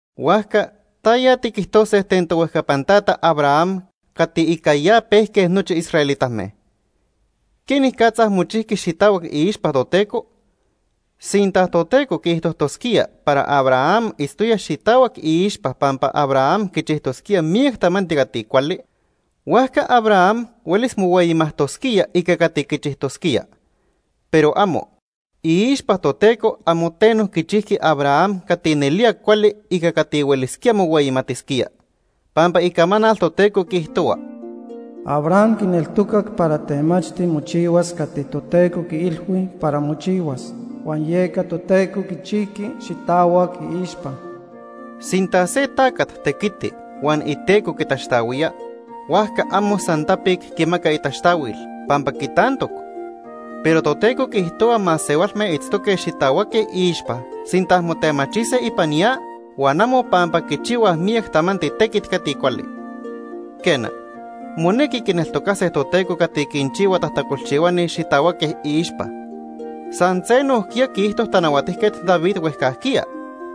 Huajca ¿taya tiquijtose ten tohuejcapan tata Abraham cati ica ya pejque nochi israelitame? ¿Quenicatza mochijqui xitahuac iixpa Toteco? Sinta Toteco quiijtojtosquía para Abraham itztoya xitahuac iixpa pampa Abraham quichijtosquía miyac tamanti cati cuali, huajca Abraham huelis mohueyimajtosquía ica cati quichijtosquía. Pero amo. Iixpa Toteco amo teno quichijqui Abraham cati nelía cuali ica cati huelisquía mohueyimatisquía. Pampa Icamanal Toteco quiijtohua: “Abraham quineltocac para temachti mochihuas cati Toteco quiilhui para mochihuas, huan yeca Toteco quichijqui xitahuac iixpa.” Sinta se tacat tequiti huan iteco quitaxtahuía, huajca amo san tapic quimaca itaxtahuil, pampa quitantoc. Pero Toteco quiijtohua masehualme itztoque xitahuaque iixpa sinta motemachise ipan ya huan amo pampa quichihuaj miyac tamanti tequit cati cuali. Quena, monequi quineltocase Toteco cati quinchihua tajtacolchihuani xitahuaque iixpa. San se nojquiya quiijto Tanahuatijquet David huejcajquiya,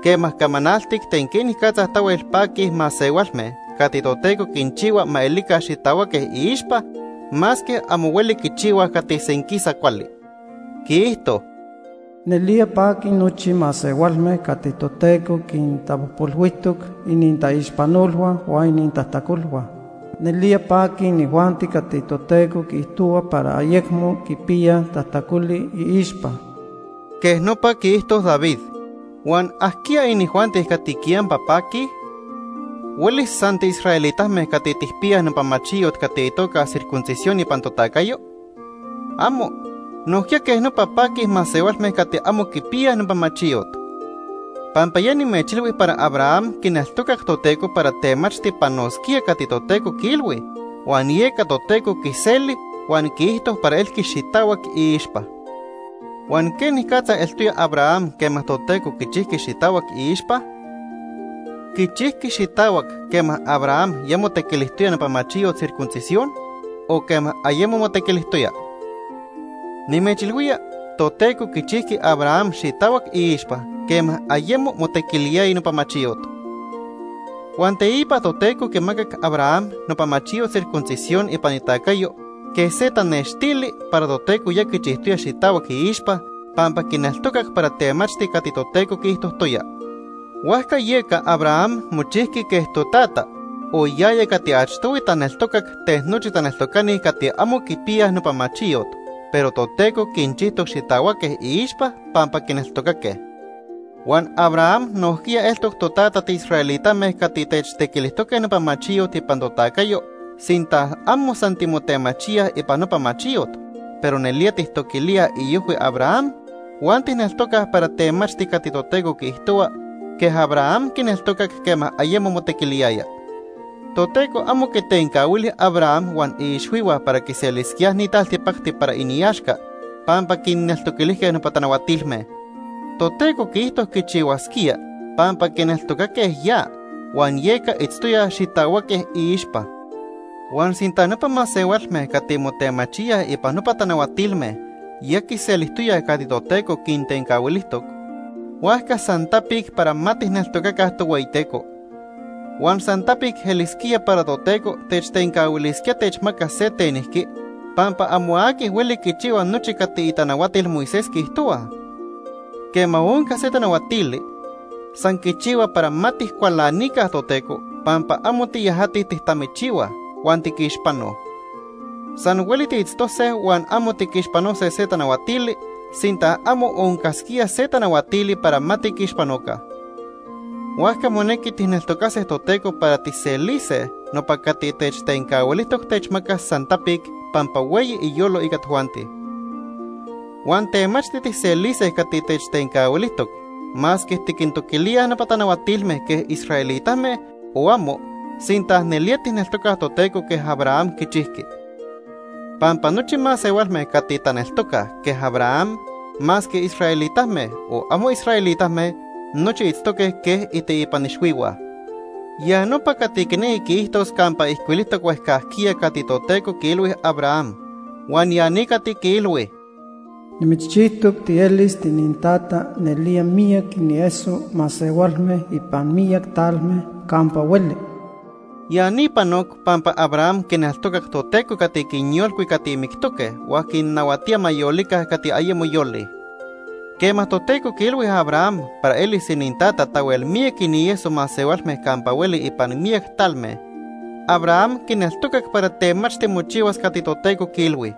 quema camanaltic ten quenicatza tahuel paquij masehualme cati Toteco quinchihua ma elica xitahuaque iixpa, masque amo hueli quichihuaj cati senquisa cuali. Quiijto: “Nelía paquij nochi masehualme cati Toteco quintapojpolhuijtoc inintaixpanolhua huan inintajtacolhua. Nelía paquij inijuanti cati Toteco quiijtohua para ayecmo quipiyaj tajtacoli iixpa.” Quej nopa quiijto David. Huan ¿ajquiya inijuanti cati quiyampa paquij? ¿Huelis san tiisraelitame cati tijpiyaj nopa machiyot cati itoca circuncisión ipan totacayo? ¡Amo! Nojquiya quej nopa paquij masehualme cati amo quipiyaj nopa machiyot. Pampa ya nimechilhui para Abraham quineltocac Toteco para temachti panosquía cati Toteco quiilhui, huan yeca Toteco quiseli huan quiijto para elqui xitahuac iixpa. ¿Huan quenicatza eltoya Abraham quema Toteco quichijqui xitahuac iixpa? ¿Quichijqui xitahuac quema Abraham ya motequilijtoya nopa machiyot circuncisión, o quema ayemo motequilijtoya? Nimechilhuía, Toteco quichijqui Abraham xitahuac iixpa quema ayemo motequiliyaya nopa machiyot. Huan teipa Toteco quimacac Abraham nopa machiyot circuncisión ipan itacayo quej se tanextili para Toteco ya quichijtoya xitahuac iixpa pampa quineltocac para temachti cati Toteco quiijtojtoya. Huajca yeca Abraham mochijqui quej totata, o yaya cati achtohui taneltocac ten nochi taneltocani cati amo quipiyaj nopa machiyot, pero Toteco quinchijtoc xitahuaque iixpa pampa quineltocaque. Huan Abraham nojquiya eltoc totata tiisraelitame cati techtequilijtoque nopa machiyot ipan totacayo sinta amo san timotemachíaj ipan nopa machiyot, pero nelía tijtoquilíaj iojhui Abraham huan tijneltocaj para temachti cati Toteco quiijtohua quej Abraham quineltocac quema ayemo motequiliyaya. Toteco amo quitencahuili Abraham huan iixhuihua para quiselisquíaj ni taltipacti para iniaxca pampa quinneltoquilijque nopa tanahuatilme. Toteco quiijto quichihuasquía pampa quineltocaque ya, huan yeca itztoyaj xitahuaque iixpa. Huan sinta nopa masehualme cati motemachíaj ipan nopa tanahuatilme ya quiselijtoyaj cati Toteco quintencahuilijtoc, huajca san tapic para ma tijneltocaca Tohueyiteco. Huan san tapic elisquía para Toteco techtencahuilisquía techmacas se tenijqui pampa amo aqui hueli quichihua nochi cati itanahuatil Moisés quiijtohuaj. Quema onca se tanahuatili, san quichihua para ma tijcualanica Toteco pampa amo tiyajatij tijtamichihuaj, huan tiquixpanoj. San hueli tiitztose huan amo tiquixpanose se tanahuatili, sinta amo oncasquía se tanahuatili para ma tiquixpanoca. Huajca monequi tijneltocase Toteco para tijselise nopa cati techtencahuilijtoc techmacas san tapic pampa hueyi iyolo ica tojuanti. Huan temachti tijselise cati techtencahuilijtoc masque tiquintoquilíaj nopa tanahuatilme quej israelitame o amo, sinta nelía tijneltocaj Toteco quej Abraham quichijqui. Pampa nochi masehualme cati taneltocaj quej Abraham, masque israelitame, o amo israelitame, nochi itztoque quej iteipan ixhuihua. Ya nopa cati quinequi quiijtos campa ijcuilijtoc huejcajquiya cati Toteco quiilhui Abraham, huan ya ni cati quiilhui: “Nimitzchijtoc tielis tiinintata nelía miyac inieso masehualme ipan miyac talme campa hueli.” Ya ni panoc pampa Abraham quineltocac Toteco cati quinyolcui cati mictoque huan quinnahuatía ma yolica cati ayemo yolij. Quema Toteco quiilhui Abraham para elis inintata tahuel miyac inieso masehualme campa hueli ipan miyac talme, Abraham quineltocac para temachti mochihuas cati Toteco quiilhui.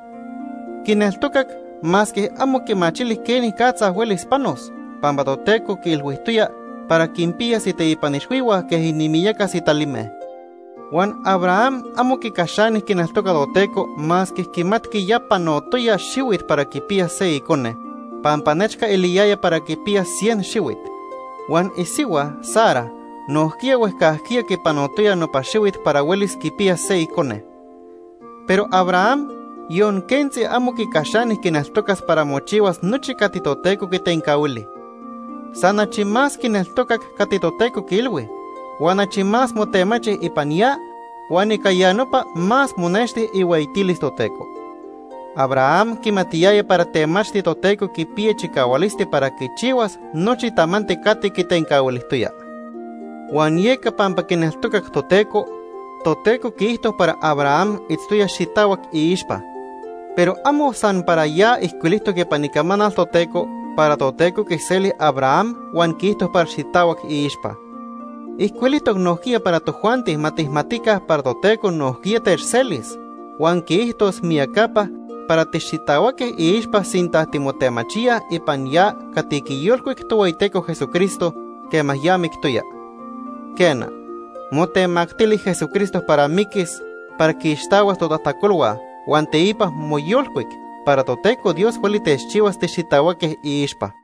Quineltocac masque amo quimachili quenicatza huelis panos, pampa Toteco quiilhuijtoya para quinpiyas iteipan ixhuihua quej inimiyaca sitalime. Huan Abraham amo quicaxani quineltoca Toteco masque quimatqui ya panotoya xihuit para quipiyas se icone pampa nechca eliyaya para quipiyas cien xihuit. Huan isihua Sara nojquiya huejcajquiya quipanotoya nopa xihuit para huelis quipiyas se icone. Pero Abraham, yon quentzi amo quicaxani quineltocas para mochihuas nochi cati Toteco quitencahuili. San achi más quineltocac cati Toteco quiilhui, huan achi más motemachi ipan ya, huan ica ya nopa más monexti ihueyitilis Toteco. Abraham quimatiyaya para temachti Toteco quipiya chicahualisti para quichihuas nochi tamanti cati quitencahuilijtoya. Huan yeca pampa quineltocac Toteco, Toteco quiijto para Abraham itztoya xitahuac iixpa. Pero amo san para ya ijcuilijtoc ipan Icamanal Toteco para Toteco quiseli Abraham huan quiijto para xitahuac iixpa. Ijcuilijtoc nojquiya para tojuanti ma tijmatica para Toteco nojquiya techselis, huan quiijtos miyacapa para tixitahuaque iixpa sinta timotemachíaj ipan ya cati quiyolcuic Tohueyiteco Jesucristo quema ya mictoya. Quena, motemactili Jesucristo para miquis para quiixtahuas totajtacolhua huan teipa moyolcuic para Toteco Dios hueli techchihuas tixitahuaque iixpa.